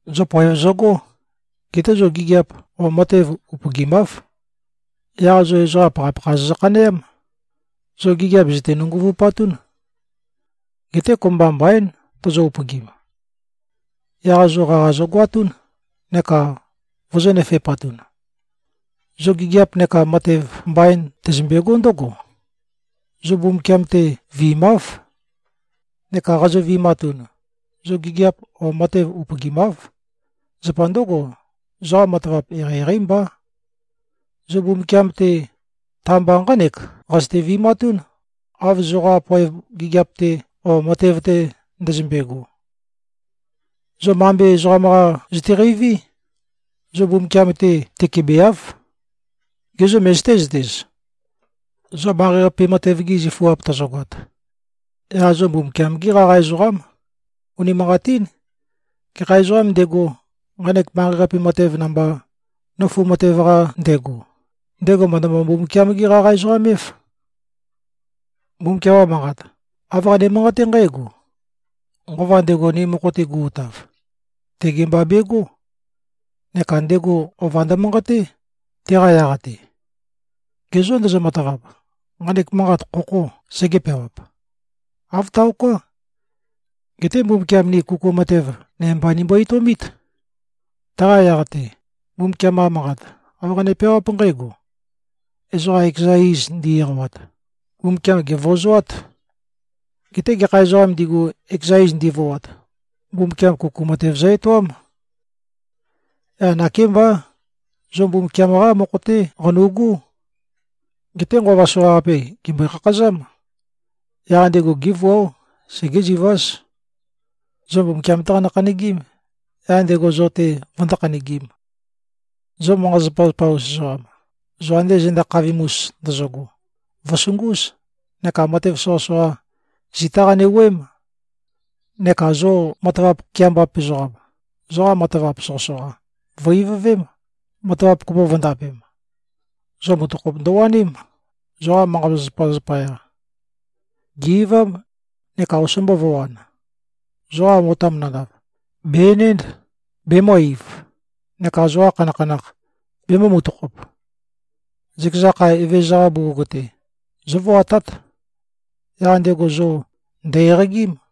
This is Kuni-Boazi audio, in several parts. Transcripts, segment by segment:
Zo poev zøgó. Geté zo gigiap o matev upøgimáv. Yaq zo ezoqa pakhapakha zozø-khaneám. Zo gigiap zø̀te-nønguvupatún. Geté kopømba mbaín tozo-upøgim. Yaq zo qaqa zogoatún neka vozō-nøfe꞉patun. Zo gigiap neka matev mbain tøzømbegó ndǿgo: Zo Mbumbukiam-te viimáv. Neka qazo-vi꞉matun, zo gigiap o matev upøgimáv. Zapa ndǿgo, zoqa matavap eqeieqeí mbá. Zo Mbumbukiam-te, ta-mba nqánek qazøte-vi꞉matún, av zoqa poev gigiap-te o matev-te ndøzømbe꞉go. Zo mambe ezoqam-qa zøteqeiví. Zo Mbumbukiam-te tøkebeáv. Gê, zo møzøté-zøtez? Zo manqei-qape matev-gi zifuap tozogoat, yaq zo Mbumbukiam-gí qaqa ezoqám. Unimanqatín. Gekha ezoqām ndego, nqanek manqei-qape matev namba, nøfu matev-qa ndego, ndego mø̀ndømø-Mbumbukiam-gé-qaqa-ezoqam-év. Mbumbukiam-qa Manqat, āv qane-manqaté nqǽgo, “Nqova ndego, ni mokho-te gu꞉-utav, tege mba begó. Neka ndego ova ndømanqaté, teqa yaq-te.” Ge zô, ndozo-matavap, nqanek manqat, khokhō segē-peawap? Āv taoká. Geté Mbumbukiam ni kuku matev nøme mba nimbo-etøomít. Taqa yaq-te, Mbumbukiam-qa Manqat, āv qane-peawáp nqǽgo, “Ezoqa ekeza iz ndi-eqawat, Mbumbukiam, gèvøozoát. Geté gekha ezoqām ndigu, ekeza iz ndivoat, Mbumbukiam kuku matev zø-etoám.” Yaq nakémbá, zo Mbumbukiam-qá mokho-té qanu꞉gú. Geté nqova soqaqape, gèmbøe-khakhazám. Yaq ndego gévuáo. Segéziváz. Zo Mbumbukiam-té qanø-khanøgím, yaq ndego zo-te vøndó-khanøgīm. Zo manqa-zapazapa-us ezoqam, zo ande zenda khavim-us ndøzøgo, vø̀sungúz, neka matev soqøsoqa, zitá qane-wuøém. Neka zo matavap keambap ezoqam, zoqa matavap soqøsoqa, vø̀-ivøvém, matavap kopo vø̄ndapem. Zo mutøkhop ndøwaním, zoqa manqa-zapazapa zapaya. Gè꞉-eivám, neka osombo vø̄wan. Zoqa otam nandav, bè-enénd, bemø̄-eiv, neka zoqa khanakhanakh, bemø̄-mutøkhop. Zøkeza kha, Evezøza-qa bugug-te, zóvoatát. Yaq ndego zo ndø̀-eqagím.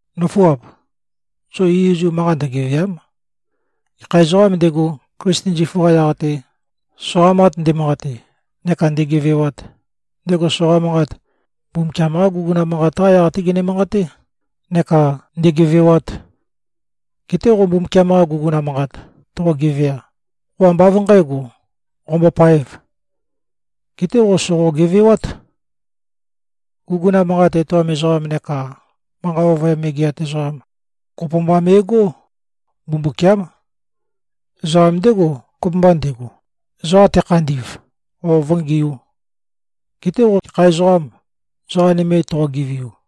Nǿfuap! Zo izuizu manqa ndøgevèa᷄m. Gekha ezoqām ndego, Klisten zifu-qa yaq-te, soqa manqat nde꞉manqate neka ndēgēvēīwāt, ndego soqa manqat, Mbumbukiam-qá guguna manqat-qá yaq-té gene-manqaté neka ndēgēvēwāt. Geté qo Mbumbukiam-qa guguna manqat toqo-gevea, qo ambá av nqǣgo, qombopaēv. Geté qo sòqo-gevewát. Guguna manqat etoam ezoqam neka manqa ovøyam megeat ezoqam kopo mba me꞉gó. Mbumbukiám. Ezoqam ndégo, kopømba ndego, ezoqa tekhandi꞉v o vǿngiū. Geté qo gekha ezoqâm, ezoqa nøme toqo-geveiu?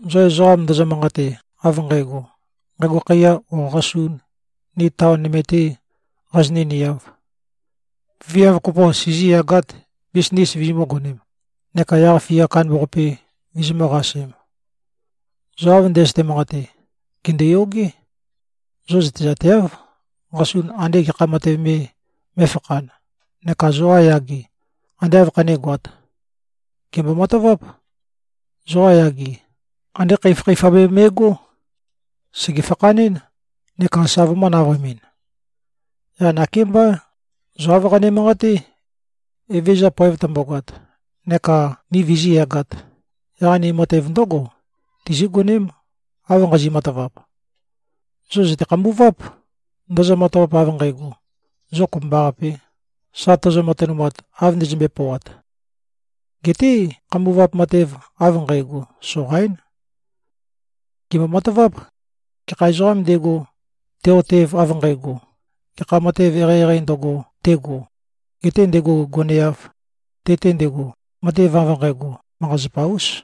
Zo ezoqam, zo ndozo-manqate, av nqægo, “Nqægo khaiya o qasun, ni taon nøme-tē qazinø̄-niāv. Viav kopo sizīyagāt, bisnis vizimǿ-gonēm, neka yaq-fia kandambaqape vizimǿ-qasēm.” Zo av ndøzøte-manqate, gèndoyogé. Zo zøtezateáv, qasun ande gekha matev me mé꞉fakhān, neka zoqa yage, ande āv khanégoāt. Gèmbo-mataváp. Zoqa yage, andé khøifakhøifa me me꞉gó. Sège-fakhanɨ́n, neka sa vømø̄-navøemɨn. Yaq nakémbá, zo āv qane-manqaté, “Evezøza poev tømbogoat neka ni vizíyagāt, yaq ni matev ndǿgo tizígoném, av nqazi꞉-matavap.” Zo zø̀te-khambuváp, ndozo-matavap, av nqægo, zo kopømbaqapē, sa tozo-matønumat, av ndøzømbøe-pøoat. Geté khambuvap matev av nqægo, soqaín. Gèmbo-mataváp. Gekha ezoqām ndego, te꞉-otev av nqægo, gekha matev eqeieqeī ndøgo, tego, getē ndego goneāv, te-te ndego, matev av nqægo, manqa-zapa-ús.